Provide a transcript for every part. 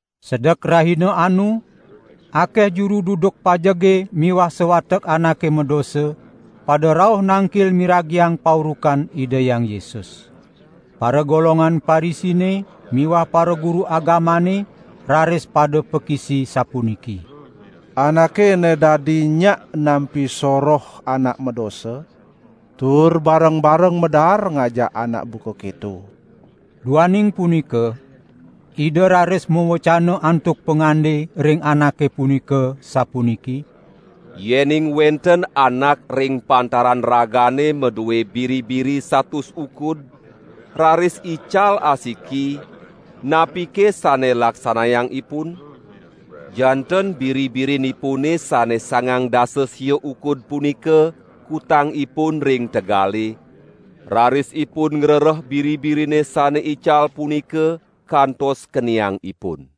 Sedek rahina anu akeh juru duduk pajege miwah sawatek anake madosa pada rauh nangkil miragiang paurukan Ida Hyang Yesus. Paragolongan Parisine miwah paraguru agamane raris pada pakisi sapuniki: "Anake ene dadi enyak nampi soroh anak madosa tur bareng-bareng madaar ngajak anak buka keto." Duaning punika Ida raris mawecana antuk pangande ring anake punika, sapuniki: "Yening wenten anak ring pantaran ragane madue biri-biri satus ukud, raris ical asiki, napike sane laksanayang ipun? Janten biri-birin ipune sane sangang dasa sia ukud punika kutang ipun ring tegale, raris ipun ngrereh biri-birine sane ical punika kantos keniang ipun.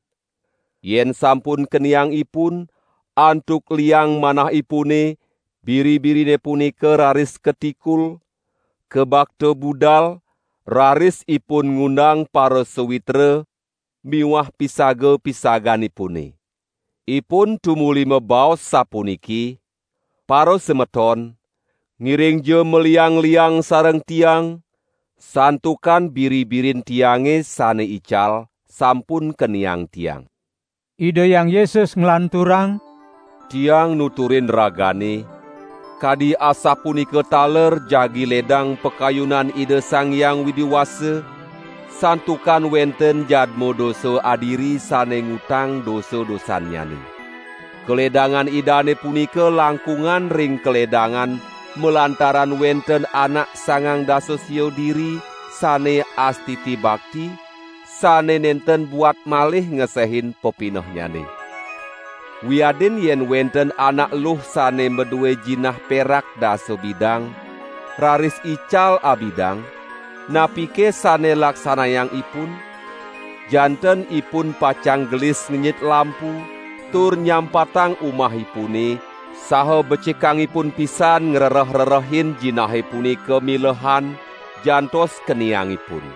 Yen sampun keniang ipun, antuk liang manahipune, biri-birine punika raris katikul, kabakta budal, raris ipun ngundang parasawitra miwah pisaga-pisaganipune. Ipun tumuli mabaos sapuniki: 'Parasemeton, ngiringja maliang-liang sareng tiang santukan biri-birin tiange sane ical sampun keniang tiang.' " Ida Hyang Yesus nglanturang: "Tiang nuturin ragane, kadi asapunika taler jagi ledang pakayunan Ida Sang Hyang Widi Wasa, santukan wenten jadma dosa adiri sane ngutang dosa-dosannyane. Kaledangan idane punika langkungan ring kaledangan malantaran wenten anak sangang dasa sia diri sane astiti bakti, sane nenten buat malih ngesehin pepinehnyane." "Wiadin yen wenten anak eluh sane madue jinah perak dasa bidang, raris ical abidang, napike sane laksanayang ipun? Janten ipun pacang gelis ngenyit lampu tur nyampatang umahipune, saha becikang ipun pisan ngrereh-rerehin jinahe punika milehan, jantos keniang ipun.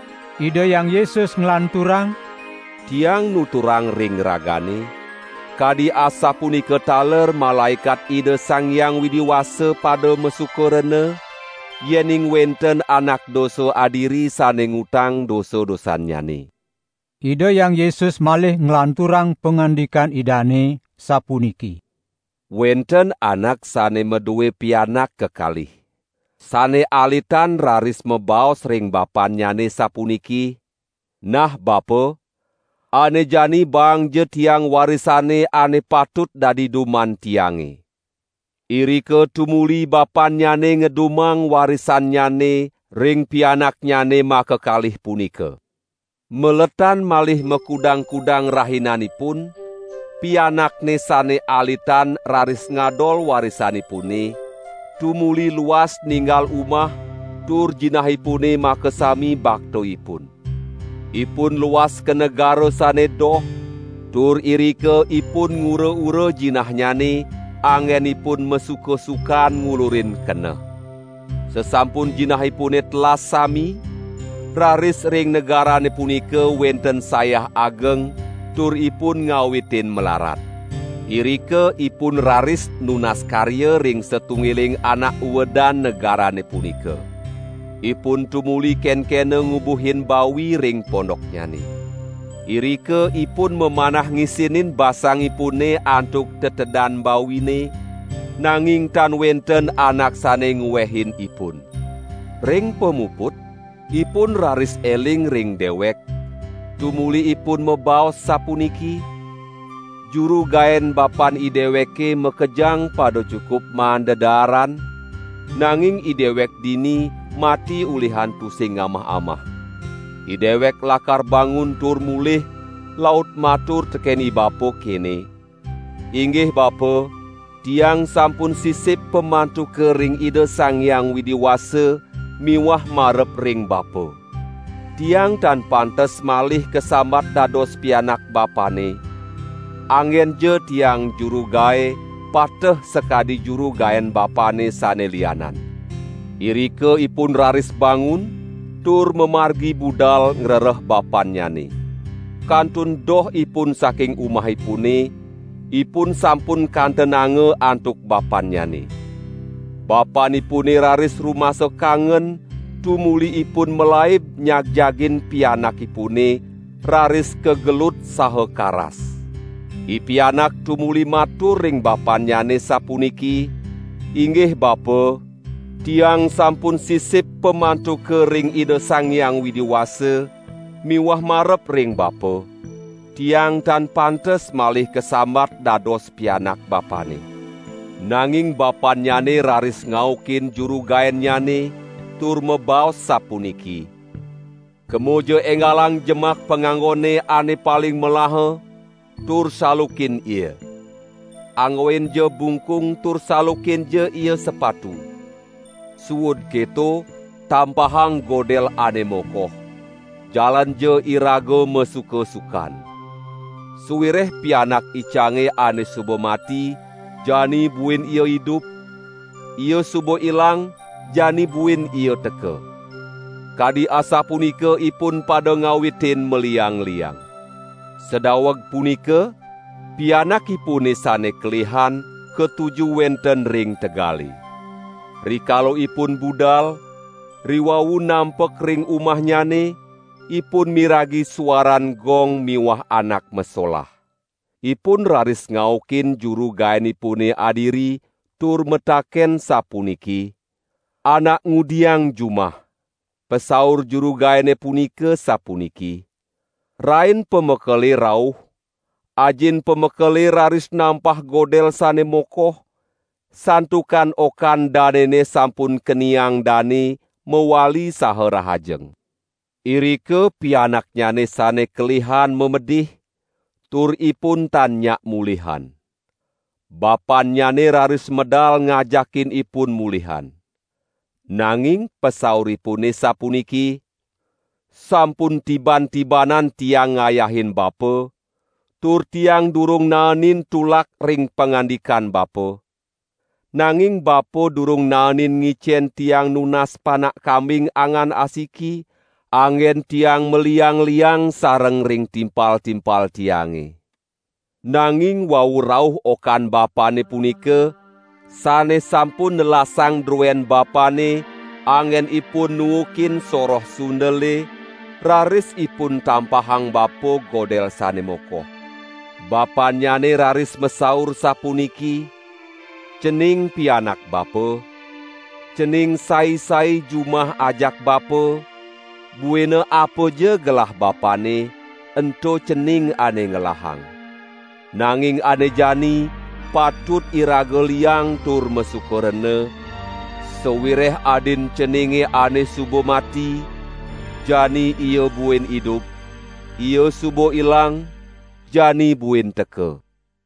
Ida Hyang Yesus nglanturang: "Tiang nuturang ring ragane, kadi asapunika taler malaekat Ida Sang Hyang Widi Wasa pada masuka rena, yening wenten anak dosa adiri sane ngutang dosa-dosannyane." Ida Hyang Yesus malih nglanturang pangandikan Idane, sapuniki: "Wenten anak sane madue pianak kekalih. Sane alitan raris mabaos ring bapannyane sapuniki: 'Nah bapa, ane jani baangja tiang warisane ane patut dadi duman tiange.' Irika tumuli bapannyane ngedumang warisannyane ring pianaknyane makakalih punika. Maletan malih makudang-kudang rahinanipun, pianakne sane alitan raris ngadol warisanipune, tumuli luas ninggal umah tur jinahipune makasami baktaipun. Ipun luas ka negara sane doh, tur irika ipun ngura-ura jinahnyane anggen ipun masuka-sukan ngulurin keneh. Sasampun jinahipune telas sami, raris ring negarane punika wenten sayah ageng tur ipun ngawitin mlarat. Irika ipun raris nunas karya ring satunggiling anak uedan negarane punika. Ipun tumuli kenkena ngubuhin bawi ring pondoknyane. Irika ipun mamanah ngisinin basangipune antuk tetedan bawine, nanging tan wenten anak sane ngwehin ipun. Ring pamuput, ipun raris eling ring dewek, tumuli ipun mabaos sapuniki: 'Juru gaen bapan ideweke makejang pada cukup maan dedaaran, nanging idewek dini mati ulihan tusing ngamah-amah. Idewek lakar bangun tur mulih laut matur teken ibapa kene: Inggih bapa, tiang sampun sisip pamantuka ring Ida Sang Hyang Widi Wasa miwah marep ring bapa. Tiang tan pantes malih kasambat dados pianak bapane; anggenja tiang juru gae, pateh sakadi juru gaen bapane sane lianan.' Irika ipun raris bangun tur mamargi budal ngrereh bapannyane. Kantun doh ipun saking umahipune, ipun sampun kantenanga antuk bapannyane. Bapanipune raris rumasa kangen tumuli ipun malaib nyagjagin pianakipune raris kagelut saha karas. Ipianak tumuli matur ring bapannyane sapuniki: 'Inggih bapa, tiang sampun sisip pamantuka ring Ida Sang Hyang Widi Wasa miwah marep ring bapa. Tiang tan pantes malih kasambat dados pianak bapane.' Nanging bapannyane raris ngaukin juru gaennyane tur mabaos sapuniki: 'Kemaja enggalang jemak panganggone ane paling melaha tur salukin ia. Anggoinja bungkung tur salukinja ia sepatu. Suud keto, tampahang godel ane mokoh! Jalanja iraga masuka-sukan. Sawireh pianak icange ane suba mati jani buin ia idup; ia suba ilang jani buin ia teka.' Kadi asapunika ipun pada ngawitin maliang-liang. Sadaweg punika pianakipune sane kelihan katuju wenten ring tegale. Rikala ipun budal, riwau nampek ring umahnyane, ipun miragi suaran gong miwah anak masolah. Ipun raris ngaukin juru gaenipune adiri, tur mataken sapuniki: 'Anak ngudiang jumah?' Pasaur juru gaene punika sapuniki: 'Rain pamekele rauh, ajin pamekele raris nampah godel sane mokoh, santukan okan danene sampun keniang dane mawali saha rahajeng.' Irika pianaknyane sane kelihan mamedih, tur ipun tan nyak mulihan. Bapannyane raris medal ngajakin ipun mulihan. Nanging pasauripune sapuniki: 'Sampun tiban-tibanan tiang ngayahin bapa, tur tiang durung naenin tulak ring pangandikan bapa, nanging bapa durung naenin ngicen tiang nunas panak kambing angan asiki anggen tiang maliang-liang sareng ring timpal-timpal tiange. Nanging wau rauh okan bapane punika, sane sampun nelasang druen bapane anggen ipun nuukin soroh sundele, raris ipun tampahang bapa godel sane mokoh.' Bapannyane raris masaur sapuniki: 'Cening pianak bapa, cening sai-sai jumah ajak bapa, buina apaja gelah bapane, ento cening ane ngelahang. Nanging ane jani patut iraga liang tur masuka rena, sawireh adin ceninge ane suba mati, jani ia buin idup, ia suba ilang, jani buin teka.' "